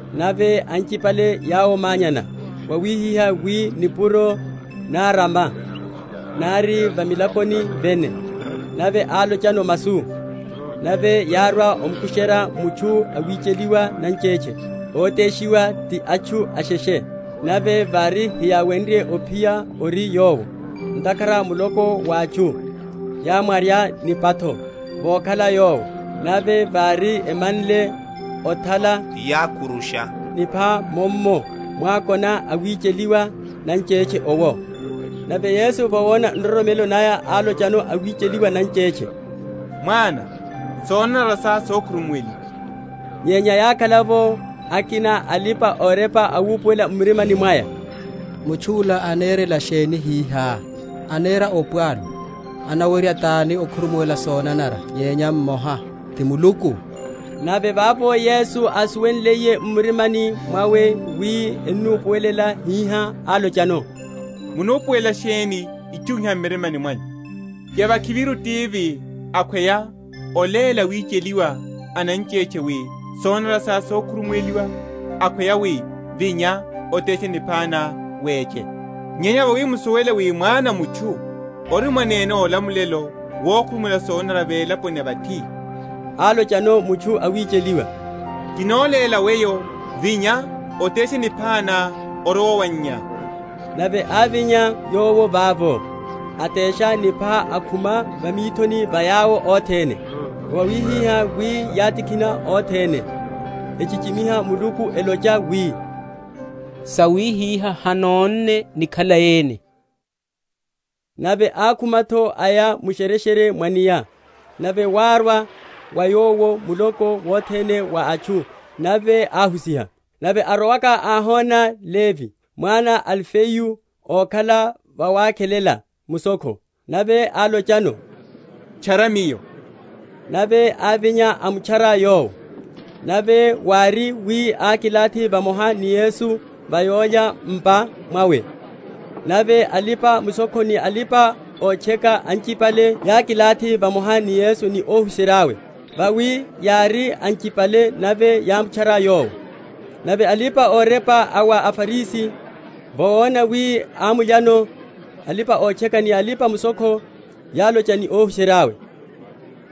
Nave anchipale yáwomanyana wawihihá wi nipuro nárama, nari va milakoni vene; nave álochano masu. Nave yárwa ómukusherya mutchu awicheliwa nanchetche, óteshiwa ti atchu asheshe. Nave vári heyáwenrye ophiya ori Yowo, ntakhara muloko wa atchu, yámwarya nipatho vokhala Yowo; nave vári emanle othala, yákurusha nipha mummo mwákona awicheliwa nanchetche owo. Nave Yesu vawona nroromelo naya, álochano awicheliwa nanchetche, Mwana, sonanara sá sokhurumuweliwa. Nyenya yákhala’vo akina a alipa‐orepa awupuwela m’mirimani mwaya, Mutchu’la anerela sheni hihá? anera opwalu; anawerya tani okhurumuwela sonanara nyenya mmoha, ti Muluku? Nave vavo Yesu ásuwenliye m’murimani mwawe wi enamupuwela hihá, álochano, Munupuwelela sheni itchu iha m’mirimani mwanyu? Yavakhiviru tivi akhweya oléla awicheliwa nanchetche wi, Sonanara sá sokhurumuweliwa; akhweya wi, Vinya, oteshe nipha ná, weche? Nyenya vawi musuwele wi Mwana a mutchu ori mwanene olamulelo wokhurumuwela sonanara velaponi ya vathi (álochano mutchu awicheliwa), Kinoléla weyo, Vinya, oteshe nipha ná, orowe owannyá. Nave ávinya yowo vavo, atesha nipha, akhuma va mithoni va yawo othene; wawihihá wi yátikhina othene, echichimiha Muluku, elocha wi, Sawihiha hanónne ni khalai ene. Oitchaniwa wa Levi. Nave ákhuma’tho aya mu’shereshere mwa’nia; nave wárwa wa Yowo muloko wothene wa atchu nave áháhusiha. Nave arowaka áhona Levi, mwana a Alifeyu ókhala vawakhelela mushokho, nave álochano, Tchara Miyo. Nave ávinya, amutchara Yowo. Nave wári wi ákilathi vamoha ni Yesu va yólya m’pa mwawe nave alipa‐mushokho ni alipa‐otcheka anchipale yákilathi vamoha ni Yesu ni óhuserya’we; vawi yári anchipale nave yámutchara Yowo. Nave alipa‐orepa a wa aFarisi, vawona wi anamulyano alipa‐otcheka ni alipa‐mushokho, yálocha ni óhuserya’we,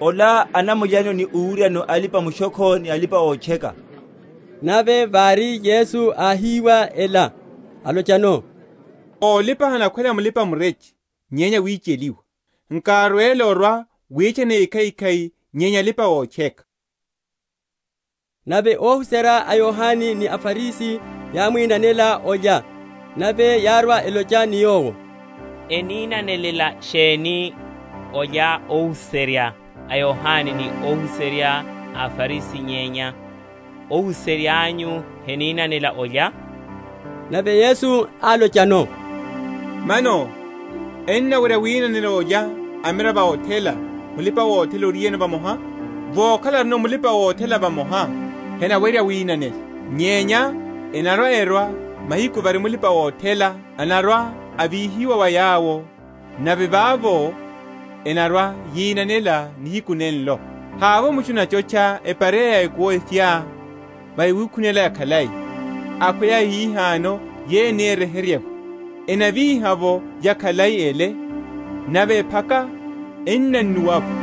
Ola anamulya ni owuryano alipa‐mushokho ni alipa‐otcheka. Nave vari Yesu áhiwa ela, álochano, Ólipa henakhwela mulipa‐mureche nyenya awicheliwa; nkárwele orwa‐witchana ékhaikhai nyenya alipa‐otcheka. Oinanela olya. Nave óhuserya a Yohane ni aFarisi yámwinanela olya; nave yárwa, elocha ni Yowo, Eninanelela sheni olya óhuserya a Yohane ni óhuserya a aFarisi, nyenya óhuserya anyu heninanela olya? Nave Yesu álochano, Mano ennawerya winanela olya amiravo a othela, mulipa‐othela oriyeno vamoha? Vokhala arino mulipa‐othela vamoha, henawerya winanela. Nyenya enarwa‐erwa mahiku vári mulipa‐othela anarwa‐avihiwa wa yawo nave vavo enarwa‐yinanela nihiku nenenlo. Havovo mutchu anachotcha epareya ya ekuwo ephya va yawikhunela yakhalai; akhweya yahihano yeyo eni eryeherye’vo, enavíha’vo yakhalai ele, nave ephaka enannuwa’vo.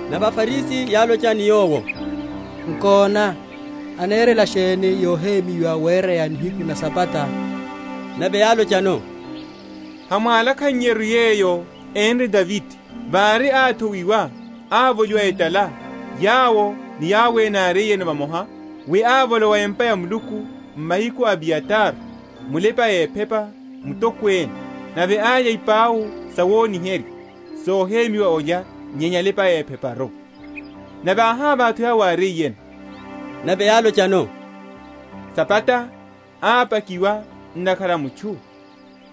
Nave aFarisi yálocha ni Yowo, Nkona, enerela sheni yohemyiwa wereya nihiku na Sabata? Nave álochano, Hamwálakhannyeru yeyo énre Davide, vari áthowiwa, avoliwa etala, yowo ni yawo ene yárino vamoha? Wi ávolowa empa ya Muluku mahiku a Abiyatare, mulipa‐ephepa mutokwene, nave álya ipau sawoniherya, sohemyiwa olya, nyenya alipa‐epheparu, nave áhávaha’tho yawo áriyeno. Nave álochano, Sabata ápakiwa ntakhara a mutchu,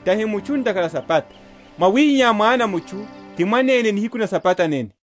tahi mutchu ntakhara a Sabata. Mwawihihá Mwana a mutchu ti mwanene nihiku na Sabata nene.